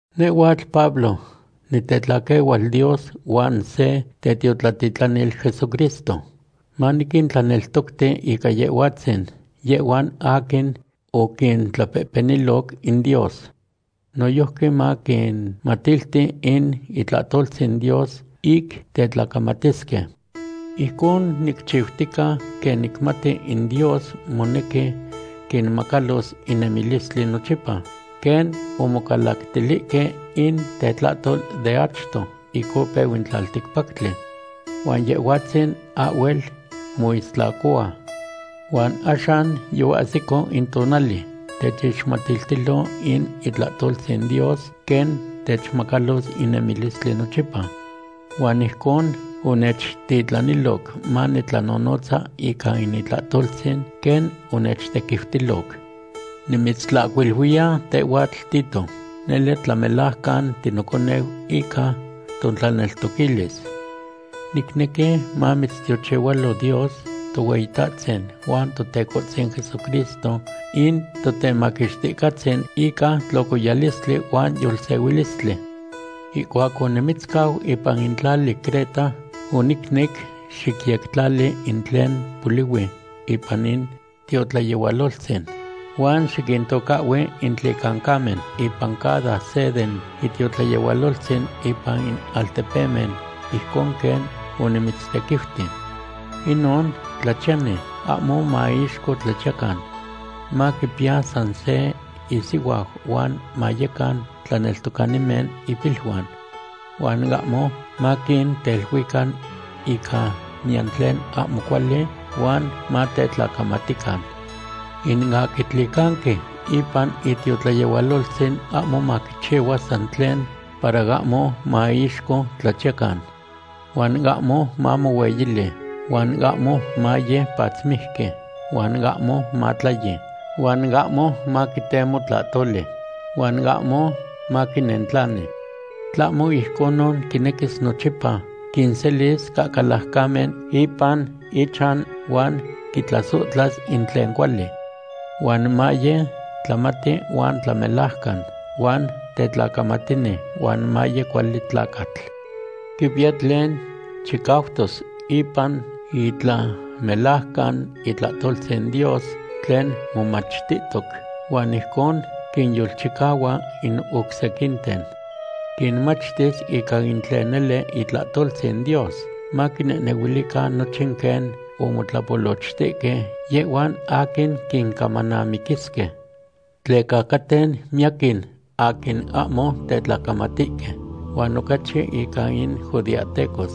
Nehhuatl Pablo, nitetlaquehual Dios huan se tetiotlatitlanil Jesucristo, maniquintlaneltocti ica Yehhuatzin yehhuan aquin oquintlapehpeniloc in Dios. Noyojqui maniquinmatilti in itlahtoltzin Dios ic tetlacamatisque. Ijcon nicchiutica quen nicmati in Dios monequi quinmacalos in nemilistli nochipa, quen omocalactilihque in tetlahtol de achto ic opeu in tlalticpactli. Huan Yehhuatzin ahhuel moistlacohua. Huan axan yoahsico in tonali techixmatiltilo in itlahtoltzin Dios quen techmacalos in nemilistli nochipa. Huan ijcon onechtitlaniloc manitlanonotza ica in itlahtoltzin, quen onechtequiutiloc. Nimitztlahcuiluiya tehhuatl Tito, nele tlamelajcan tinoconeu ica totlaneltoquilis. Nicnequi mamitztiochihualo Dios Tohueyitahtzin huan Totecohtzin Jesucristo in Totemaquixticahtzin ica tlocoyalistli huan yolsehuilistli. Ihcuac onimitzcau ipan in tlali Creta onicnec xicyectlali in tlen polihui ipan in tiotlayehualoltzin. Huan xiquintocahhui in tlicancamen ipan cada se den itiotlayehualoltzin ipan in altepemen, ijcon quen onimitztequiuti. Inon tlachiyani ahmo maiixco tlachiyacan. Maquipiya san se isihuau huan mayecan tlaneltocanimen ipiluan. Huan ahmo maquinteluican ica niyan tlen ahmo cuali huan matetlacamatican. In aquin tlicanqui ipan itiotlayehualoltzin ahmo maquichihua san tlen para ahmo maiixco tlachiyacan. Huan ahmo mamohueyili, huan ahmo maye patzmijqui, huan ahmo matlayi, huan ahmo maquitemo tlahtoli, huan ahmo maquinentlani. Tlahmo ijconon quinequis nochipa quinselis cahcalajcamen ipan ichan huan quitlasohtla in tlen cuali. Huan maye tlamati huan tlamelajcan, huan tetlacamatini, huan maye cuali tlacatl. Quipiya tlen chicautos ipan itlamelajcan itlahtoltzin Dios tlen momachtihtoc, huan ijcon quinyolchicahua in oc sequinten. Quinmachtis ica in tlen nele itlahtoltzin Dios, maquinehnehuilican nochin quen omotlapolochtihque yehhuan aquin quincamanamiquisque. Tleca caten miyaquin aquin ahmo tetlacamatihque, huan ocachi ica in judeahtecos.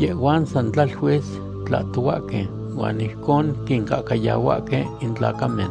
Yehhuan san tlaluis tlahtohuahque huan ijcon quincahcayahuahque in tlacamen.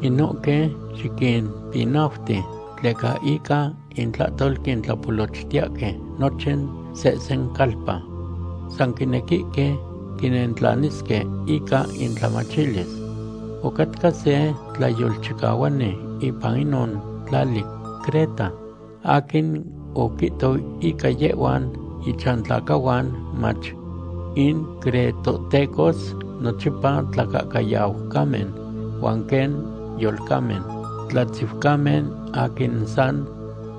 Inohque xiquimpinauti, tleca ica intlahtol quintlapolochtiyahque nochin sehsen calpa. San quinequihque quinentlanisque ica intlamachtilis. Ocatca se tlayolchicahuani ipan inon tlali Creta aquin oquihto ica yehhuan ichantlacahuan mach: “In cretohtecos nochipa tlacahcayaucamen huan quen yolcamen, tlatziucamen aquin san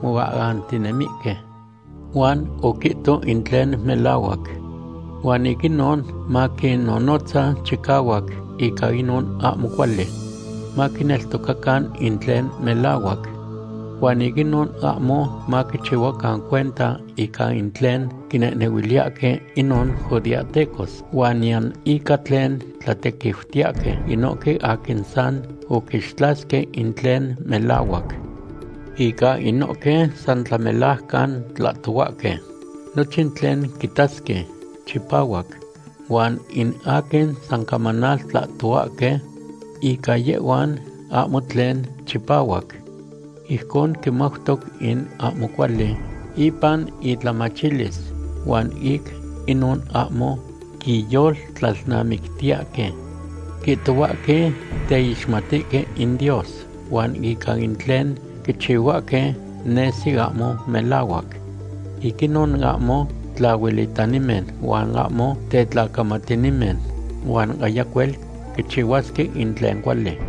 moahantinemihque.” Huan oquihto in tlen melahuac. Huan ic inon maquinnonotza chicahuac ica inon ahmo cuali. Maquineltocacan in tlen melahuac. Huan ic inon ahmo maquichihuacan cuenta ica in tlen quinehnehuiliyahque inon judeahtecos huan niyan ica tlen tlatequiutiyahque inohque aquin san oquixtlasque in tlen melahuac. Ica inohque san tlamelajcan tlahtohuahque, nochin tlen quitasque chipahuac, huan in aquin san camanaltlahtohuahque, ica yehhuan ahmo tlen chipahuac. Ijcon quimautoc in ahmo cuali ipan itlamachilis huan ic inon ahmo quiyoltlalnamictiyahque. Quihtohuahque teixmatihque in Dios, huan ica in tlen quichihuahque nesi ahmo melahuac. Ic inon ahmo tlahuelitanimen huan ahmo tetlacamatinimen, huan ayacuel quichihuasque in tlen cuali.